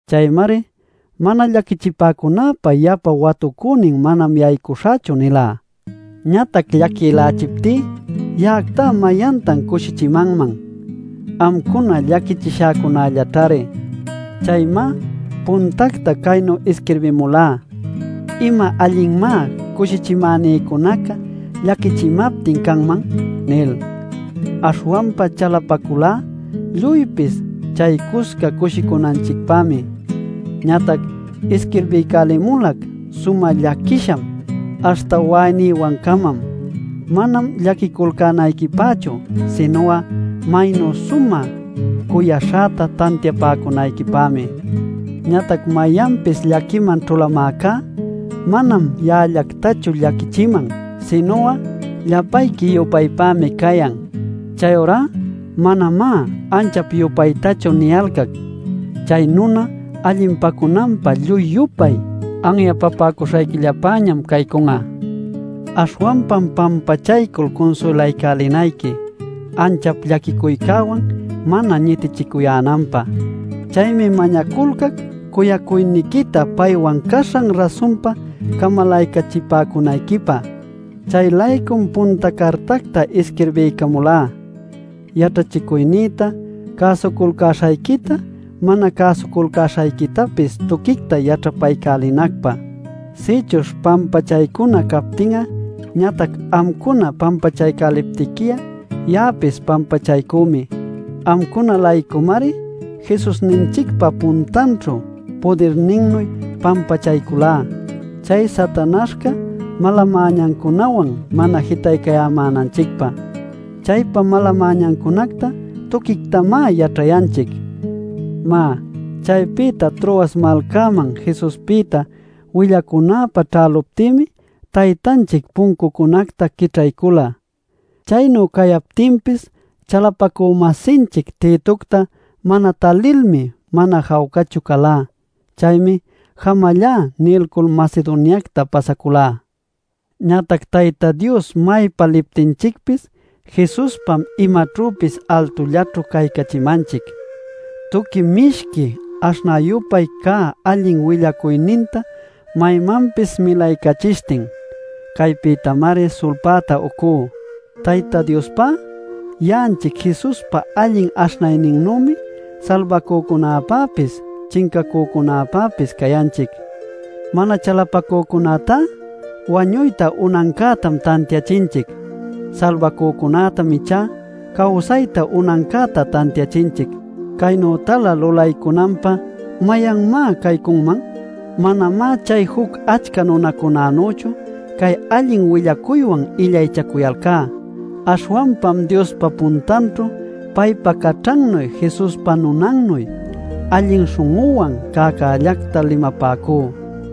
Chaymari “Mana llaquichipäcunäpä yapa watucünin manam yaycuśhächu” nilá. Ñatac llaquïlächiptí ¿ya'acta mayantan cushichimanman? Amcuna llaquichishacunällaćhari. Chaymá puntacta caynu isquirbimulá “¿Ima allinmá cushichimänïcunaca llaquichimaptin canman?” nil. Aśhwanpa chalapaculá lluypis chaycusca cushicunanchicpämi. Ñatac isquirbiycälimulac sumä llaquisham, aśhta wa'aynïwancamam. Manam llaquiculcänayquipächu, sinu'a maynu sumä cuyaśhäta tantiapäcunayquipämi. Ñatac mayanpis llaquiman ćhulamäcá manam ya'allactachu llaquichiman, sinu'a llapayqui-yupaypämi cayan. Chayurá manamá anchap-yupaytachu niyalcac. Chay nuna allinpacunanpä lluy-yupay anyapapäcuśhayquillapäñam caycun'a. Aśhwanpam pampachaycul cunsuylaycälinayqui, anchap llaquicuycäwan mana ñitichicuyänanpä. Chaymi mañaculcac cuyacuyniquita paywan caśhan rasunpa camalaycachipäcunayquipä. Chay-laycum punta cartacta isquirbiycamulá yaćhachicuynïta cäsuculcäśhayquita mana cäsuculcäśhayquitapis tuquicta yaćhapaycälinacpä. Sïchuśh pampachaycuna captin'a ñatac amcuna pampachaycäliptiqui'a ya'apis pampachaycümi. Amcuna-laycumari Jesusninchicpa puntanćhu pudirninnuy pampachaycülá chay Satanaśhca mala-mäñancunawan mana jitaycayämänanchicpä. Chaypa mala-mäñancunacta tuquictamá yaćhayanchic. Má, chaypïta Troas malcäman Jesuspïta willacunäpä ćhäluptïmi Taytanchic puncucunacta quićhaycula. Chaynu cayaptinpis chalapacü-masinchic Titocta mana talilmi mana jawcachu calá. Chaymi “jamallá” nilcul Macedoniacta pasaculá. Ñatac Tayta Dios maypa liptinchicpis Jesuspam imaćhüpis altullaćhu caycachimanchic tuqui mishqui aśhnä-yupay cä allin willacuyninta maymanpis milaycachishtin. Caypïtamari sulpäta ucú. Tayta Diospá ya'anchic Jesuspa allin aśhnayninnümi salbacücunäpäpis chincacücunäpäpis cayanchic. Mana chalapacücunätá wañuyta unancätam tantiachinchic. Salbacücunätam ichá cawsayta unancäta tantiachinchic. Caynütalä lulaycunanpä ¿mayanmá caycunman? Manamá chay juc achca nunacunanüchu cay allin willacuywan illaychacuyalcá. Aśhwanpam Diospa puntanćhu paypa caćhannuy Jesuspa nunannuy allin śhun'üwan cäcällacta limapäcú.